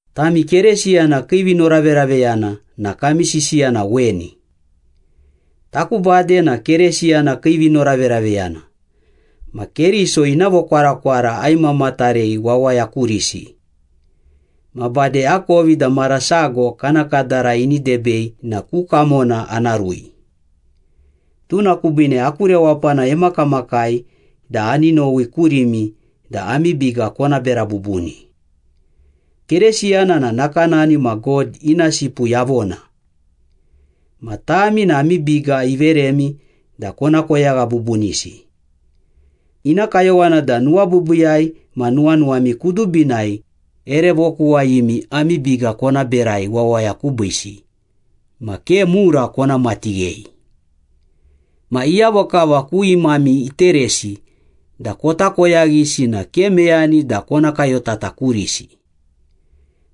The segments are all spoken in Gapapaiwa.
Tami Keresiyana kii vinoraveraveyana na kami sisiya na weni. Taku bade na Keresiyana kii vinoraveraveyana, ma Keriso ina vokwarakwara aimamatarei wawaya kurisi. Ma bade akovi da mara sago kana kadara ini debei na ku kamona ana rui. Tuna kubiine aku rewapana emakamakai da ani nowi kurimi da ami biga kona bera bubuni. Keresiyana na nakanani ma God ina sipu yavona. Ma tami na ami biga iveremi da kona koyagha bubunisi. Ina kayowana da nuwabiibiiyai ma nuwanuwami kudubinai ere vokuwayimi ami biga kona berai wawaya kubiisi, ma ke mura kona matighei. Ma iyavo kava ku imami iteresi da kota koyaghisi na ke meyani da kona kayotata kurisi.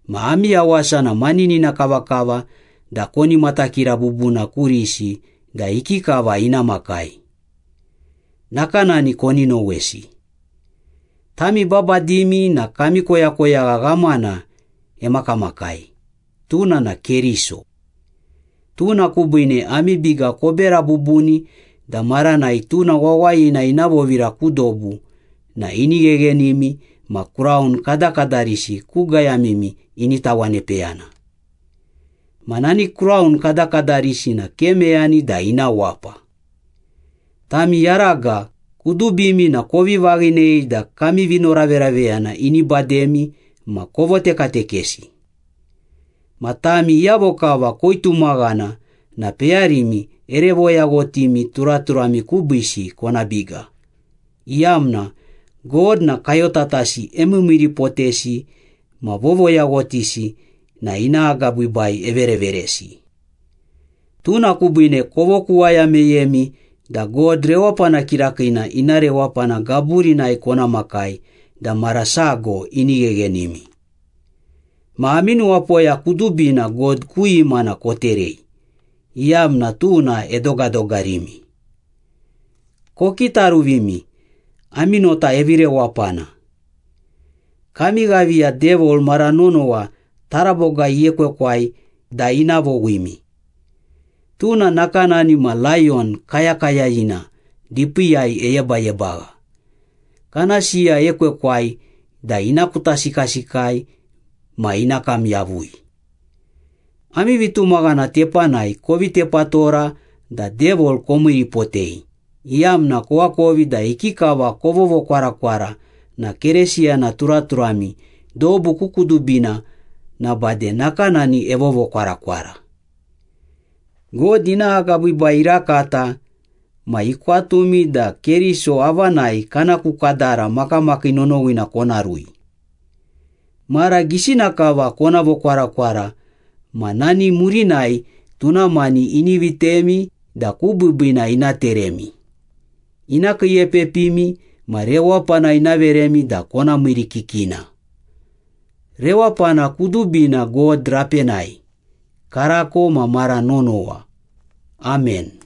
Ma ami yawasa na maninina kavakava da koni matakira bubuna kurisi da ikikava ina makai. Nakanani koni nowesi. Tami babadimi na kami koyakoyagha ghamana emakamakai, tuna na Keriso. Tuna kubiine ami biga kobera bubuni da maranai tuna wawayina ina vovira ku dobu na ini gheghenimi ma kraun kadakadarisi ku gayamimi ini tawanepeyana. Ma nani kraun kadakadarisi na ke meyani da ina wapa. Tami yaraga, kudubimi na kovi vaghinei da kami vinoraveraveyana ini bademi ma kovotekatekesi. Ma tami iyavo kava koitumaghana na peyarimi ere voyaghotimi turaturami kubiisi kona biga, iyamna “God na kayotatasi emiimiiripotesi ma vovoyaghotisi na ina agabiibai evereveresi.” Tuna kubiine kovokuwaya meyemi da God rewapana kirakiina ina rewapana gaburinai kona makai da mara sago ini gheghenimi. Ma ami nuwapoya kudubina God ku imana koterei, iyamna tuna edogadogarimi. Kokitaruvimi, ami nota evi rewapana. Kami ghaviya Devil mara nonowa taraboga iekwekwai da ina vowimi. Tuna nakanani ma layon kayakayayina dipiiyai eyebayebagha, kana siya ekwekwai da ina kutasikasikai ma ina kam yavui. Ami vitumaghana tepanai kovi tepatora da Devil komiiripotei, iyamna koakovi da ikikava kovovokwarakwara na Keresiyana turaturami dobu ku kudubina na bade nakanani evovokwarakwara. God ina agabiibai irakata ma ikwatumi da Keriso avanai kana ku kadara makamakii nonowina kona rui. Mara gisina kava kona vokwarakwara ma nani murinai tuna mani ini vitemi da ku biibiina ina teremi, ina kiiepepimi ma rewapana ina veremi da kona miirikikina. Rewapana kudubina God rapenai, karako ma mara nonowa. Amen.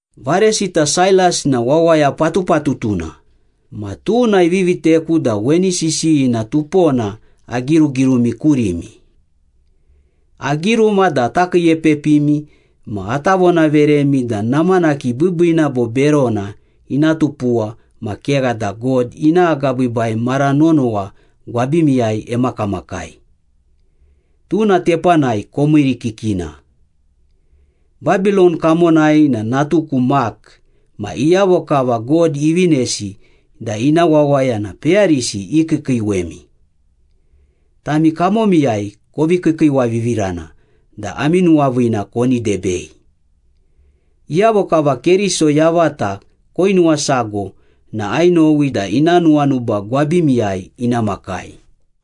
Varesita Sailas na wawaya patupatutuna, ma tuna ivi viteku da weni sisiyina tupona agirugirumi kurimi. Agiruma da ata kiiepepimi ma ata vonaveremi da namanaki biibiina bo berona ina tupuwa ma kegha da God ina agabiibai mara nonowa gwabimiyai emakamakai. Tuna tepanai komiirikikina. Babilon kamonai na natuku Mak ma iyavo kava God ivinesi da ina wawaya na peyarisi ikiikiiwemi. Tami kamomiyai kovi kiikiiwavivirana da ami nuwaviina koni debei. Iyavo kava Keriso yavata koinuwasago na ainowi da ina nuwanuba gwabimiyai ina makai.